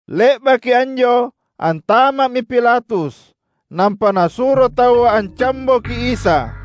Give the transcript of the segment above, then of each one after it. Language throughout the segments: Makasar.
Le’baki anjo antama’mi Pilatus nampa nasuro taua ancamboki Isa.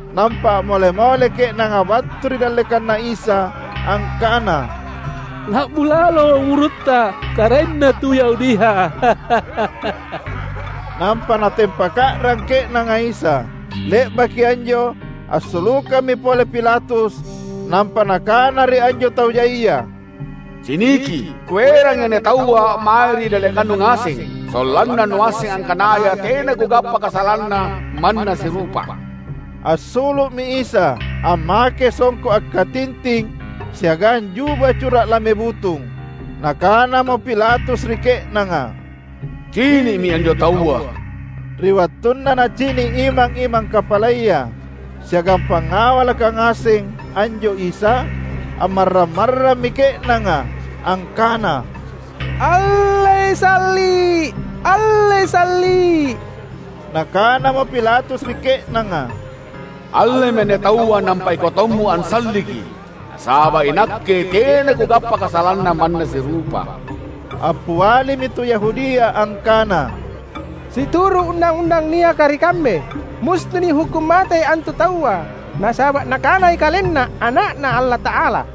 Nampa a’mole-mole ke’nanga battu ri dallekanNa Isa angkana, "La’bu lalo umurutTa, karaenna tu Yahudia!" Nampa natempaka’rang ke’nanga Isa. Le’baki anjo assulukammi pole Pilatus nampa nakana ri anjo tau jaia, "Ciniki! Kuerangi anne Taua mae ri dallekannu ngaseng, sollanna nuasseng angkanaya tena kugappa kasalanNa manna sirupa." Assulu’mi Isa, ammake songko’ akkatinting siagang juba cura’ lame butung. Nakanamo Pilatus ri ke’nanga, "Cini’mi anjo Taua." Ri wattunna nacini’ imang-imang kapalaya siagang pangawalaka ngaseng anjo Isa, ammarrang-marrammi ke’nanga, angkana, "Allei salli’! Allei salli’!" Nakanamo Pilatus ri ke’nanga, "Allemi anne Taua nampa ikau tommo ansalliki. Nasaba’ inakke tena kugappa kasalanNa manna sirupa." Appialimi tu Yahudia angkana, "Situru’ undang-undang niaka ri kambe, musti nihukkung matei antu Taua, nasaba’ Nakanai KalenNa Ana’Na Allata’ala."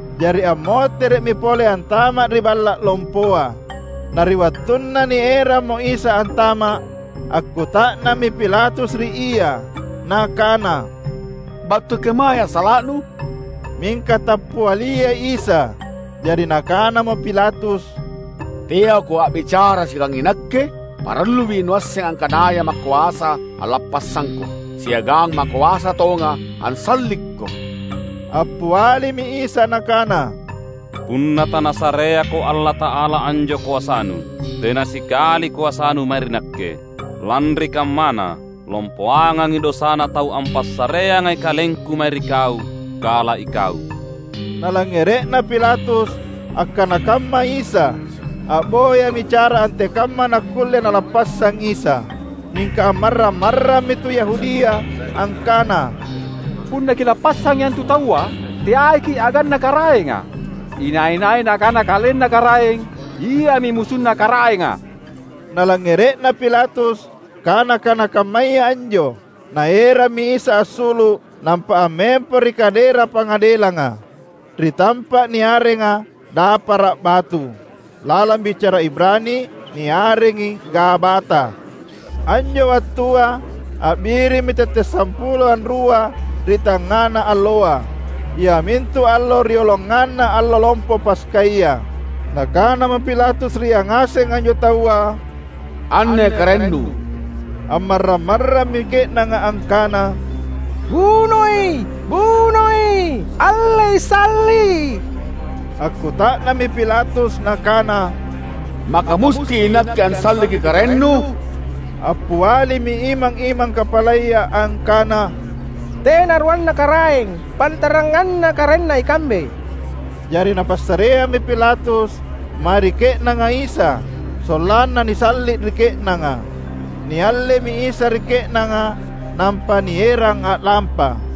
Jari ammotere’mi pole antama’ ri balla’ lompoa. Na ri wattunna nierammo Isa antama’, akkuta’nammi Pilatus ri Ia, nakana, "Battu kemae assala’Nu?" Mingka tappialiai Isa. Jari nakanamo Pilatus, "TeaKo a’bicara siagang inakke? Parallui Nuasseng angkanaya makoasa’ allappassangKo, siagang makoasa tonga’ ansallikKo!" Appialimi Isa Nakana, "Punna taNasareako’ Allata’ala anjo koasanu, tena sikali koasanu mae ri Nakke. Lanri kammana, lompoangangi dosana tau ampassareangai KalengKu mae ri kau, kala ikau." Nalangngere’na Pilatus akkana kamma Isa, a’boyami cara antekamma nakkulle nalappassang Isa. Mingka ammarrang-marrammi tu Yahudia, angkana, "Punna kilappassangi antu Taua, teaiki’ aganna Karaenga! Inai-nai nakana kalenna karaeng, iami musunna Karaenga!" Nalangngere’na Pilatus kana-kana kammaya anjo, naerammi Isa assulu’ nampa ammempo ri kadera pangadelanga, ri tampa’ niarenga Dapara’ Batu. (Lalang bicara Ibrani niarengi Gabata.) Anjo wattua a’birimmi tette’ sampulo anrua ri tangngana alloa, iamintu allo rioloanganna Allo Lompo Paskaya. Nakanamo Pilatus ri yangaseng anjo taua, "Anne karaennu." Ammarrang-marrammi ke’nanga, angkana, "Bunoi! Bunoi! Allei Salli’!" Akkuta’nammi Pilatus nakana, "Maka musti inakke ansalliki karaennu?" Appialimi imang-imang kapalaya angkana, "Tena ruanna karaeng pantaranganna Karaenna ikambe!" Jari napassareammi Pilatus mae ri ke’nanga Isa sollanna nisalli’ ri ke’nanga. Niallemi Isa ri ke’nanga, nampa nierang a’lampa.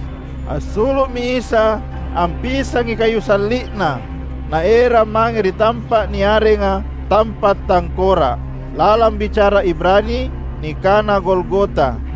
Assulu’mi Isa ampisangi kayu salli’Na, Naerang mange ri tampa’ niarenga "Tampa’ Tangkora’". (Lalang bicara Ibrani nikana Golgota.)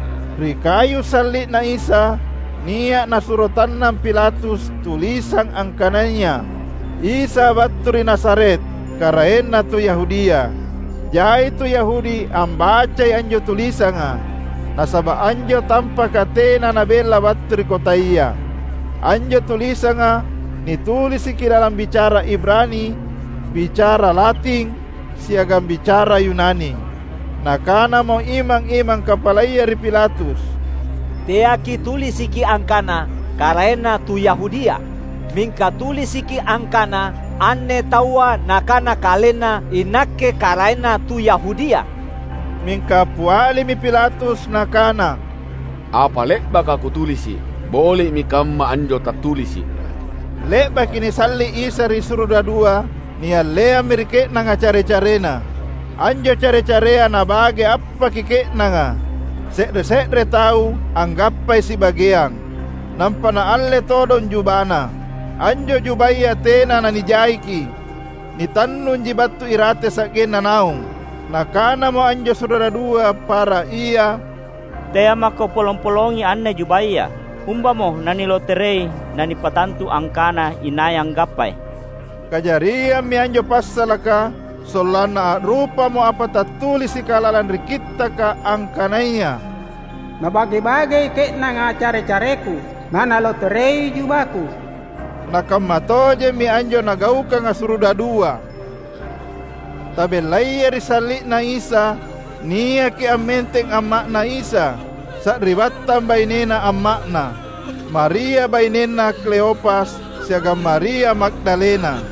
Ri kayu salli’Na Isa nia’ nasuro tannang Pilatus tulisang angkanaya: "Isa battu ri Nazaret, Karaenna Tu Yahudia". Jai tu Yahudi ambacai anjo tulisanga, nasaba’ anjo tampaka tena nabella battu ri kotaya. Anjo tulisanga nitulisiki lalang bicara Ibrani, bicara Lating, siagang bicara Yunani. Nakanamo imang-imang kapalaya ri Pilatus, "Teaki’ tulisiki angkana, ‘Karaenna tu Yahudia’, mingka tulisiki angkana, ‘Anne Taua Nakana KalenNa, iNakke Karaenna tu Yahudia.’" Mingka appialimi Pilatus nakana, "Apa le’baka kutulisi’, boli’mi kamma anjo tattulisi’." Le’baki nisalli’ Isa ri surudadua, nialleammi ri ke’nanga care-careNa. Anjo care-carea nabage appaki ke’nanga: se’re-se’re tau anggappai sibageang. Nampa naalle todong jubaNa. Anjo jubaya tena nanijaiki — nitannunji battu irate sa’genna naung. Nakanamo anjo surudadua para ia, "Tea’ mako polong-polongi anne jubaya. Umbamo naniloterei nanipattantu angkana inai anggappai." Kajariammi anjo passalaka sollanna a’rupamo apa tattulisika lalang ri Kittaka angkanaya: "Nabage-bagei ke’nanga care-careKu nanaloterei jubaKu." Na kamma tojemmi anjo nagaukanga surudadua. Tabellayai ri salli’Na Isa, niaki ammenteng amma’Na Isa, sari’battang bainena amma’Na, Maria bainenna Kleopas, siagang Maria Magdalena.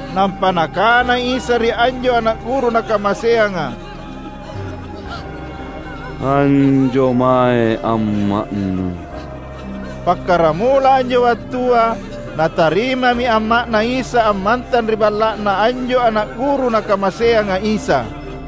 Nampa Nakana Isa ri anjo ana’ guru Nakamaseanga, "Anjo mae amma’nu." Pakkaramula anjo wattua natarimami amma’Na Isa ammantang ri balla’na anjo ana’ guru Nakamaseanga Isa.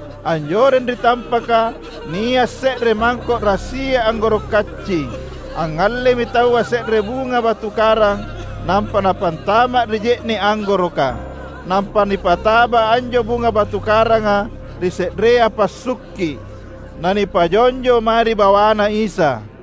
Anjoreng ri tampaka nia’ se’re mangko’ rassia anggoro’ kacci. Angngallemi taua se’re bunga batu karang nampa napantama’ ri je’ne’ anggoroka. Nampa nipataba anjo bunga batu karanga ri se’rea passukki’, nanipajonjo mae ri bawaNa Isa.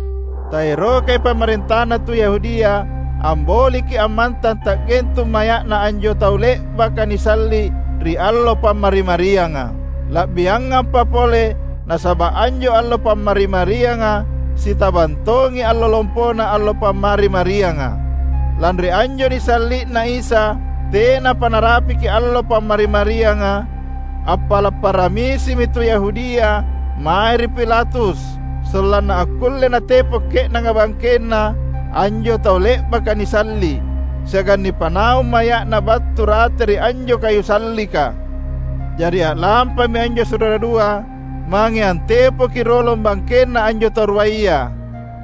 Taerokai pamarentana tu Yahudia amboliki ammantang ta’gentung maya’na anjo tau le’baka nisalli’ ri allo Pammari-marianga. La’biangampa pole nasaba’ anjo allo Pammari-marianga sitabang tongi Allo Lompona Allo Pammari-marianga. Lanri anjo nisalli’Na Isa tenapa narapiki allo Pammari-marianga, appala’ paramisimi tu Yahudia mae ri Pilatus sollanna akkulle natepo’ ke’nanga bangkenna anjo tau le’baka nisalli’, siagang nipanaung maya’na battu rate ri anjo kayu sallika. Jari a’lampami anjo surudadua mange antepoki rolong bangkenna anjo tau ruaya,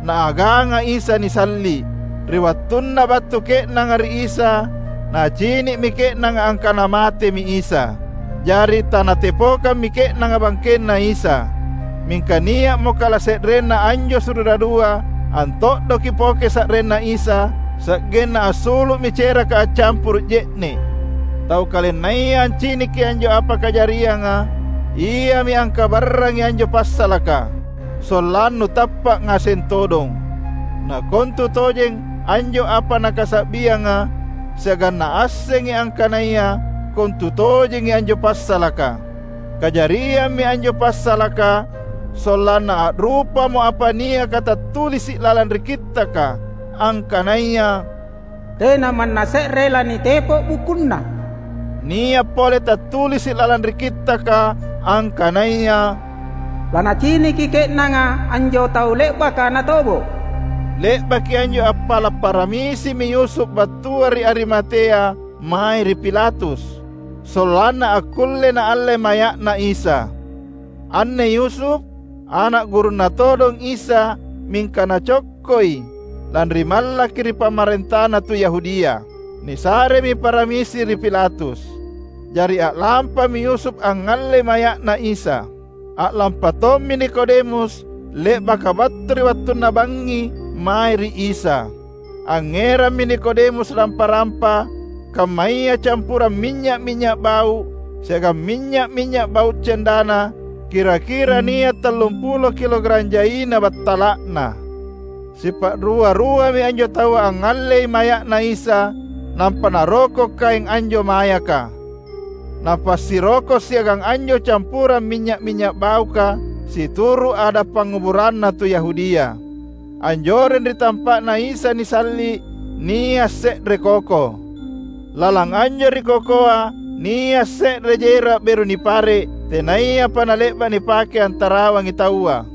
Naaganga Isa nisalli’. Ri wattunna battu ke’nanga ri Isa, nacini’mi ke’nanga angkana matemi Isa. Jari tanatepokami ke’nanga bangkenNa Isa. Mingka nia’mo kalase’renna anjo surudadua anto’doki poke sa’rinNa Isa, sa’genna assulu’mi ceraka accampuru’ je’ne’. Tau kalennaya anciniki anjo apa kajarianga, iami angkabarrangi anjo passalaka, sollannu tappa’ ngaseng todong. Na kontutojeng anjo apa nakasa’bianga, siagang naassengi angkanaya kontutojengi anjo passalaka. Kajariammi anjo passalaka, sollanna a’rupamo apa niaka tattulisi’ lalang ri Kittaka, angkanaya, "Tena manna se’re lanitepo’ bukunNa". Nia’ pole tattulisi’ lalang ri Kittaka, angkanaya, "Lanaciniki ke’nanga anjo Tau le’baka natobo’". Le’baki anjo appala’ paramisimi Yusuf battua ri Arimatea mae ri Pilatus, sollanna akkulle naalle maya’Na Isa. (Anne Yusuf, ana’ gurunNa todong Isa mingka nacokkoi, lanri mallaki ri pamarentana tu Yahudia.) Nisaremi paramisi ri Pilatus. Jari a’lampami Yusuf angngallei maya’Na Isa. A’lampa tommi Nikodemus le’baka battu ri wattunna bangngi mae ri Isa. Angngerammi Nikodemus rampa-rampa, kammaya campurang minynya’-minynya’ bau’, siagang minynya’-minynya’ bau’ cendana — kira-kira nia’ tallumpulo kilogarang jaina battala’na. Sipa’rua-ruami anjo taua angngallei maya’Na Isa, nampa naroko’ kaeng anjo mayaka, napasiroko’ siagang anjo campurang minynya’-minynya’ bauka, situru’ ada’ panguburanna tu Yahudia. Anjoreng ri tampa’Na Isa nisalli’ nia’ se’re koko. Lalang anjo ri kokoa nia’ se’re jera’ beru nipare’ tenayapa nale’ba’ nipake antarawangi taua.